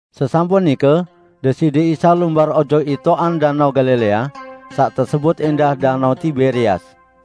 Sesampun nike Deside Isa lumbar ojok itoqan Danao Galilea, saq tesebut ẽndah Danao Tiberias.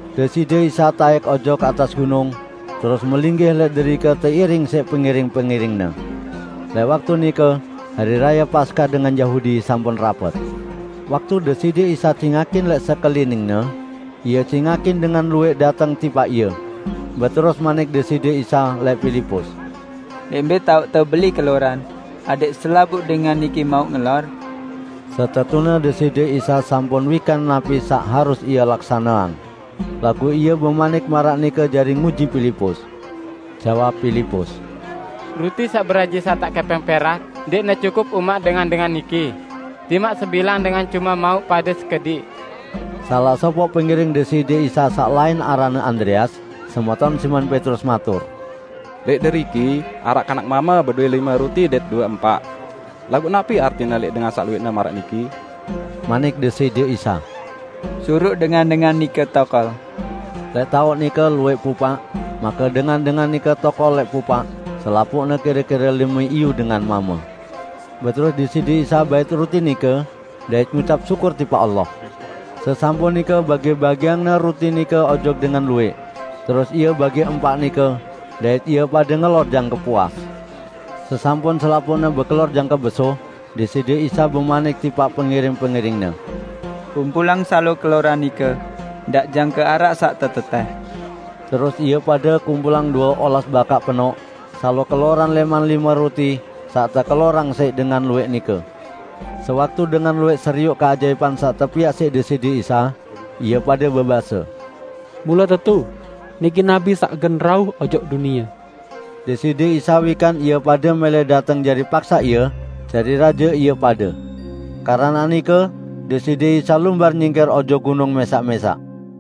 Deside Isa taẽk ojok atas gunung, terus melinggih lẽq derike teiring siq pengiring-pengiring-Ne. Lẽq waktu nike Hari Raye Paskah dengan Yahudi sampun rapet. Waktu Deside Isa cingakin lẽq sekelining-Ne, Ie cingakin dengan luwẽq dateng tipaq Ie. Beterus manik Deside Isa lẽq Pilipus, "Lẽq mbẽ taoqte beli keloran, adẽq selapuq dengan niki mauq ngelor?" ( Setetune Deside Isa sampun wikan napi saq harus Ie laksaneang, laguq Ie bemanik maraq nike jari nguji Pilipus.) Jawab Pilipus, "Ruti saq beraji satak kẽpẽng perak ndẽqne cukup umaq dengan-dengan niki, timaq sebilang dengan cume mauq pade sekediq." Salaq sopoq pengiring Deside Isa saq lain aranne Andreas, semeton Simon Petrus matur, "Lẽq deriki araq kanak mame bedowẽ lime ruti dait due empaq. Laguq napi artine lẽq dengan saq luwẽqne maraq niki?" Manik Deside Isa, "Suruq dengan-dengan nike tokol." Lẽq taoq nike luwẽq pupaq, make dengan-dengan nike tokol lẽq pupaq -- selapuqne kire-kire lime iyu dengan mame. Beterus Deside Isa bait ruti nike, dait ngucap syukur tipaq Allah. Sesampun nike bagi-bagiang-Ne ruti nike ojok dengan luwẽq. Terus Ie bagi empaq nike, dait ie pade ngelor jangke puas. Sesampun selapuqne bekelor jangke besuh, Deside Isa bemanik tipaq pengiring-pengiring-Ne, "Kumpulang salo keloran nike; ndaq jangke araq saq tetetẽh." Terus ie pade kumpulang due olas bakaq penoq salo keloran lẽman lime ruti saq tekelorang siq dengan luwẽq nike. Sewaktu dengan luwẽq serioq keajaipan saq tepiaq siq Deside Isa, ie pade bebase, "Mule tetu, niki Nabi saq gen rauh ojok dunie!" Deside Isa wikan ie pade mẽlẽ dateng jari paksaq Ie jari raje ie pade. Keranaq nike Deside Isa lumbar nyingkir ojok gunung mẽsaq-mẽsaq.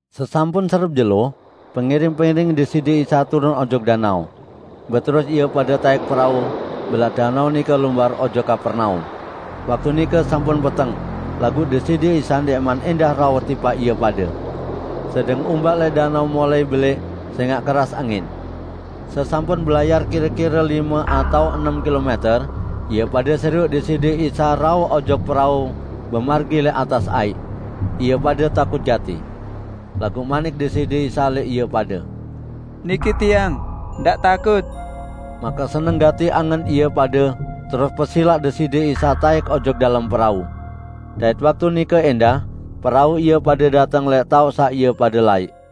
Sesampun serep jelo, pengiring-pengiring Deside Isa turun ojok danao. Beterus ie pade taẽk perau mbelat danao nike lumbar ojok Kapernaum. Waktu nike sampun peteng laguq Deside Isa ndẽqman ẽndah rauh tipaq ie pade, sedeng umbak lẽq danao mulai belẽq sẽngaq keras angin. Sesampun belayar kire-kire lime atao enem kilomẽter, ie pade serioq Deside Isa rauh ojok perau bemargi lẽq atas aiq. Ie pade takut gati. Laguq manik Deside Isa lẽq ie pade, "Niki Tiang, ndaq takut!" Make seneng gati angen ie pade terus pesilaq Deside Isa taẽk ojok dalem perau. Dait waktu nike ẽndah perau ie pade dateng lẽq taoq saq ie pade laiq.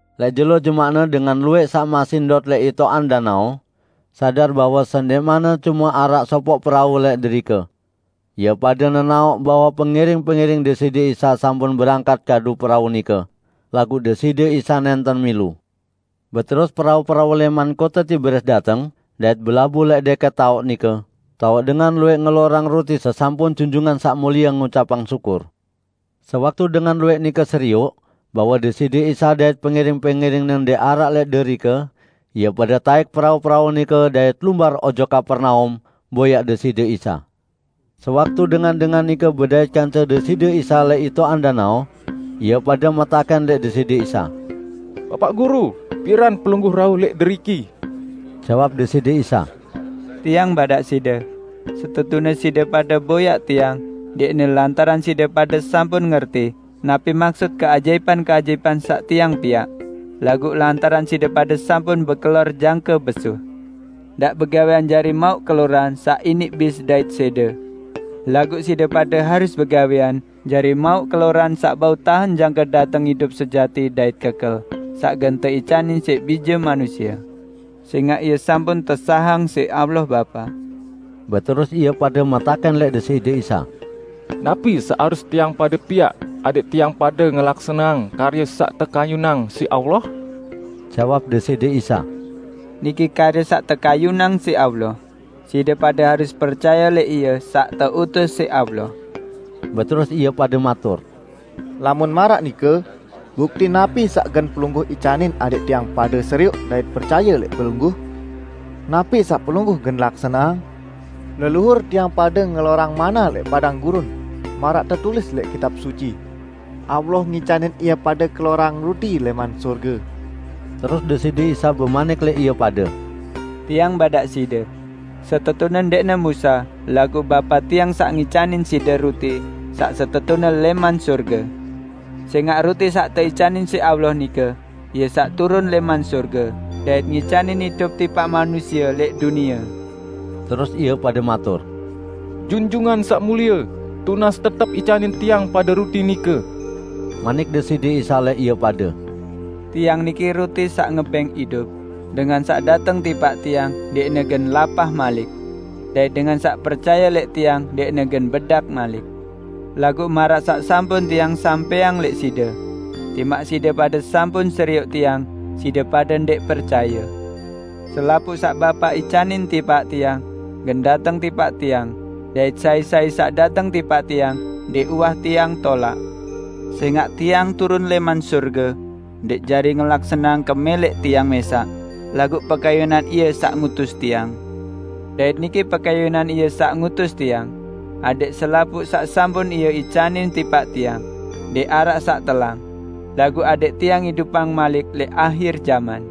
Lẽq jelo jemaqne dengan luwẽq saq masih ndot lẽq itoqan danao, sadar bahwe sendẽqmanne cume araq sopoq perau lẽq derike. Ie pade nenaoq bahwe pengiring-pengiring Deside Isa sampun berangkat kadu perau nike, laguq Deside Isa nẽnten milu. Beterus perau-perau lẽman kote Tiberias dateng dait belabuh lẽq dẽkẽt taoq nike, taoq dengan luwẽq ngelorang ruti sesampun Junjungan Saq Mulie ngucapang syukur. Sewaktu dengan luwẽq nike serioq bahwe Deside Isa dait pengiring-pengiring-Ne ndẽq araq lẽq derike, ie pade taẽk perau-perau nike dait lumbar ojok Kapernaum boyaq Deside Isa. Sewaktu dengan-dengan nike bedait kance Deside Isa lẽq itoqan danao, ie pade metakẽn lẽq Deside Isa, "Bapaq Guru, piran Pelungguh rauh lẽq deriki?" Jawab Deside Isa, "Tiang badaq side, setetune side pade boyaq Tiang ndẽqne lantaran side pade sampun ngerti napi maksut keajaipan-keajaipan saq Tiang piaq, laguq lantaran side pade sampun bekelor jangke besuh. Ndaq begawẽan jari mauq keloran saq iniq bis dait sẽde. Laguq side pade harus begawẽan jari mauq keloran saq bau tahen jangke dateng idup sejati dait kekel, saq gen teicanin siq Bije Manusie, sẽngaq Ie sampun tesahang siq Allah Bapa." Beterus ie pade metakẽn lẽq Deside Isa, "Napi saq harus tiang pade piaq adẽq tiang pade ngelaksaneang karye saq tekayunang siq Allah?" Jawab Deside Isa, "Niki karye saq tekayunang siq Allah: Side pade harus percaye lẽq Ie saq teutus siq Allah." Beterus ie pade matur, "Lamun maraq nike, bukti napi saq gen Pelungguh icanin adẽq tiang pade serioq dait percaye lẽq Pelungguh? Napi saq Pelungguh gen laksaneang? Leluhur tiang pade ngelorang manna lẽq padang gurun, maraq tetulis lẽq Kitab Suci, 'Allah ngicanin ie pade kelorang ruti lẽman sorge.' " Terus Deside Isa bemanik lẽq ie pade, "Tiang badaq side: Setetune ndẽqne Musa, laguq Bapa Tiang saq ngicanin side ruti saq setetune lẽman sorge. Sẽngaq ruti saq teicanin siq Allah nike Ie saq turun lẽman sorge dait ngicanin idup tipaq manusie lẽq dunie." Terus ie pade matur, "Junjungan Saq Mulie, tunas tetep icanin tiang pade ruti nike." Manik Deside Isa lẽq ie pade, "Tiang niki ruti saq ngebẽng idup, dengan saq dateng tipaq Tiang, ndẽqne gen lapah malik. Dait dengan saq percaye lẽq Tiang ndẽqne gen bedak malik." "Laguq maraq saq sampun Tiang sampẽang lẽq side: Timaq side pade sampun serioq Tiang, side pade ndẽq percaye. Selapuq saq Bapa icanin tipaq Tiang gen dateng tipaq Tiang dait sai-sai saq dateng tipaq Tiang ndẽq uwah Tiang tolaq. Sẽngaq Tiang turun lẽman sorge, ndẽq jari ngelaksaneang kemẽlẽq Tiang mẽsaq, laguq pekayunan Ie saq ngutus Tiang. Dait niki pekayunan Ie saq ngutus Tiang: Adẽq selapuq saq sampun Ie icanin tipaq Tiang, ndẽq araq saq telang; laguq adẽq Tiang idupang malik lẽq ahir jaman.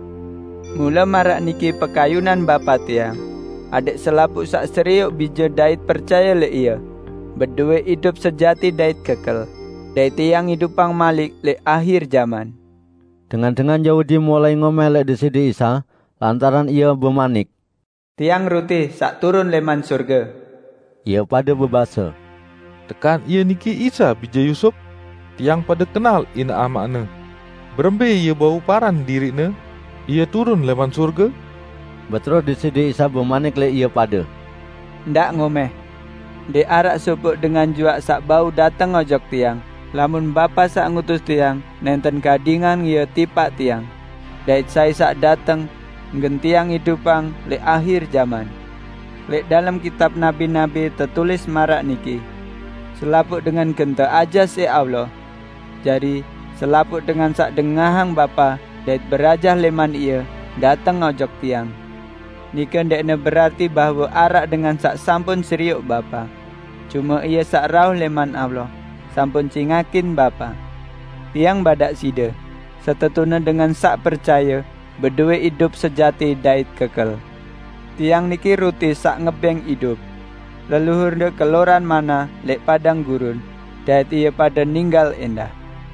Mule maraq niki pekayunan Bapa Tiang: Adẽq selapuq saq serioq Bije dait percaye lẽq Ie, bedowẽ idup sejati dait kekel, dait Tiang idupang malik lẽq ahir jaman." Dengan-dengan Yahudi mulai ngomẽh lẽq Deside Isa, lantaran Ie bemanik: "Tiang ruti saq turun lẽman sorge." Ie pade bebase, "Tekan Ie niki Isa, bije Yusup? Tiang pade kenal inaq amaq-Ne! Berembẽ Ie bau paran diriq-Ne, "Ie turun lẽman sorge?" Beterus Deside Isa bemanik lẽq ie pade, "Ndaq ngomẽh! Ndẽq araq sopoq dengan juaq saq bau dateng ojok Tiang, lamun Bapa saq ngutus Tiang, nẽnten gadingang ie tipaq Tiang; dait sai saq dateng, gen Tiang idupang lẽq ahir jaman. Lẽq dalem Kitab Nabi-nabi tetulis maraq niki: 'Selapuq dengan gen teajah siq Allah.' Jari, selapuq dengan saq dengahang Bapa dait berajah lẽman Ie, dateng ojok Tiang. Nike ndẽqne berarti bahwe araq dengan saq sampun serioq Bapa. Cume Ie saq rauh lẽman Allah, sampun cingakin Bapa. Tiang badaq side: Setetune dengan saq percaye, bedowẽ idup sejati dait kekel. Tiang niki ruti saq ngebẽng idup. Leluhurde kelorang manna lẽq padang gurun dait ie pade ninggal ẽndah.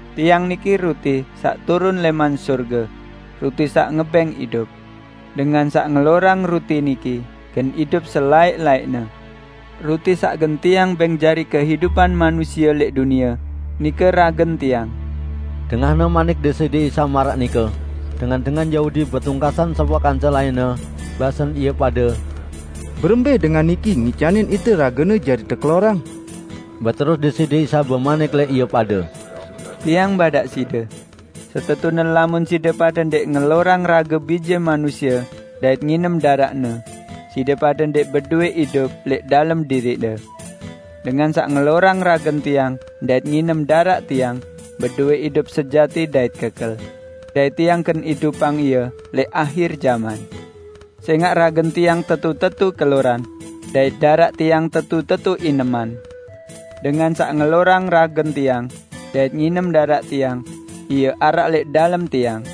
Tiang niki ruti saq turun lẽman sorge -- ruti saq ngebẽng idup. Dengan saq ngelorang ruti niki gen idup selaẽq-laẽqne. Ruti saq gen Tiang bẽng jari kehidupan manusie lẽq dunie, nike ragen Tiang." Dengahne manik Deside Isa maraq nike, dengan-dengan Yahudi betungkasan sopoq kance lainne, basen ie pade, "Berembẽ Dengan niki ngicanin ite rage-Ne jari tekelorang?" Beterus Deside Isa bemanik lẽq ie pade, "Tiang badaq side: Setetune lamun side pade ndẽq ngelorang rage Bije Manusie dait nginem daraq-Ne, side pade ndẽq bedowẽ idup lẽq dalem diriqde. Dengan saq ngelorang ragen Tiang dait nginem daraq Tiang bedowẽ idup sejati dait kekel, dait Tiang gen idupang ie lẽq ahir jaman. Sẽngaq ragen Tiang tetu-tetu keloran dait daraq Tiang tetu-tetu ineman. Dengan saq ngelorang ragen Tiang dait nginem daraq Tiang, ie araq lẽq dalem Tiang,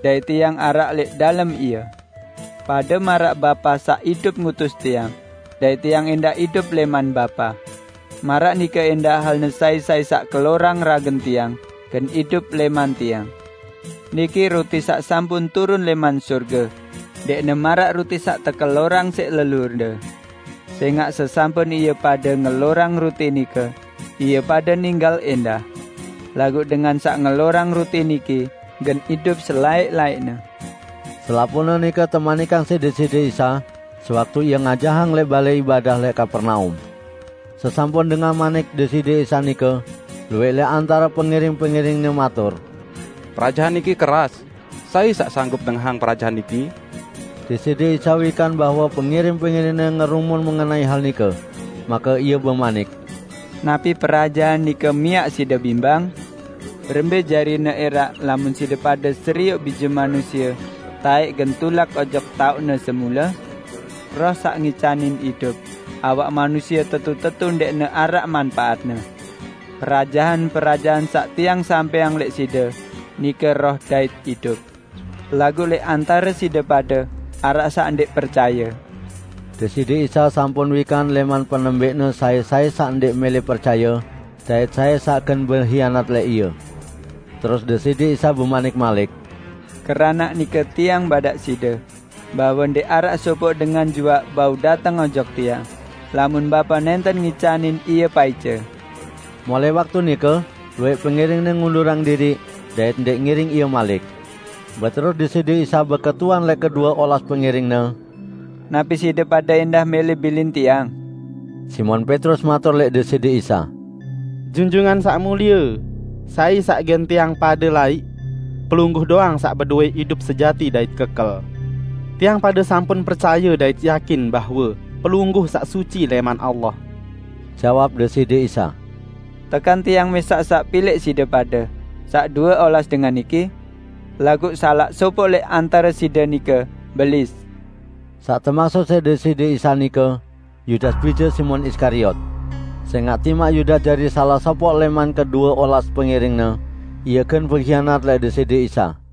dait Tiang araq lẽq dalem ie. Pade maraq Bapa saq idup ngutus Tiang, dait Tiang ẽndah idup lẽman Bapa, maraq nike ẽndah halne sai-sai saq kelorang ragen Tiang gen idup lẽman Tiang. Niki ruti saq sampun turun lẽman sorge: Ndẽqne maraq ruti saq tekelorang siq leluhurde. Sẽngaq sesampun ie pade ngelorang ruti nike, ie pade ninggal ẽndah. Laguq dengan saq ngelorang ruti niki gen idup selaẽq-laẽqne." Selapuqne nike temanikang siq Deside Isa sewaktu Ie ngajahang lẽq balẽ ibadah lẽq Kapernaum. Sesampun dengah manik Deside Isa nike, luwẽq lẽq antare pengiring-pengiring-Ne matur, "Perajahan niki keras, sai saq sanggup dengahang perajahan niki?" Deside Isa wikan bahwe pengiring-pengiring-Ne ngerumun mengenai hal nike. Make Ie bemanik, "Napi perajahan nike miaq side bimbang? Berembẽ jarine ẽraq lamun side pade serioq Bije Manusie taẽk gen tulak ojok taoq-Ne semule? Roh saq ngicanin idup, awak manusie tetu-tetu ndẽqne araq manpaatne. Perajahan-perajahan saq Tiang sampẽang lẽq side nike roh dait idup. Laguq lẽq antare side pade araq saq ndẽq percaye." (Deside Isa sampun wikan lẽman penembẽqne sai-sai saq ndẽq mẽlẽ percaye, dait sai saq gen behianat lẽq Ie.) Terus Deside Isa bemanik malik, "Keranaq nike Tiang badaq side bahwe ndẽq araq sopoq dengan juaq bau dateng ojok Tiang, lamun Bapa nẽnten ngicanin ie paice." Mulai waktu nike luwẽq pengiring-Ne ngundurang diriq, dait ndẽq ngiring Ie malik. Beterus Deside Isa beketuan lẽq kedue olas pengiring-Ne, "Napi side pade ẽndah mẽlẽ bilin Tiang?" Simon Petrus matur lẽq Deside Isa, "Junjungan Saq Mulie, sai saq gen tiang pade laiq? Pelungguh doang saq bedowẽ idup sejati dait kekel. Tiang pade sampun percaye dait yakin bahwe Pelungguh Saq Suci lẽman Allah." Jawab Deside Isa, "Tekan Tiang mẽsaq saq pilẽq side pade, saq due olas dengan niki? Laguq salaq sopoq lẽq antare side nike Belis!" Saq temaksut siq Deside Isa nike, Yudas bije Simon Iskariot. Sẽngaq timaq Yudas jari salaq sopoq lẽman kedue olas pengiring-Ne, ie gen behianat lẽq Deside Isa.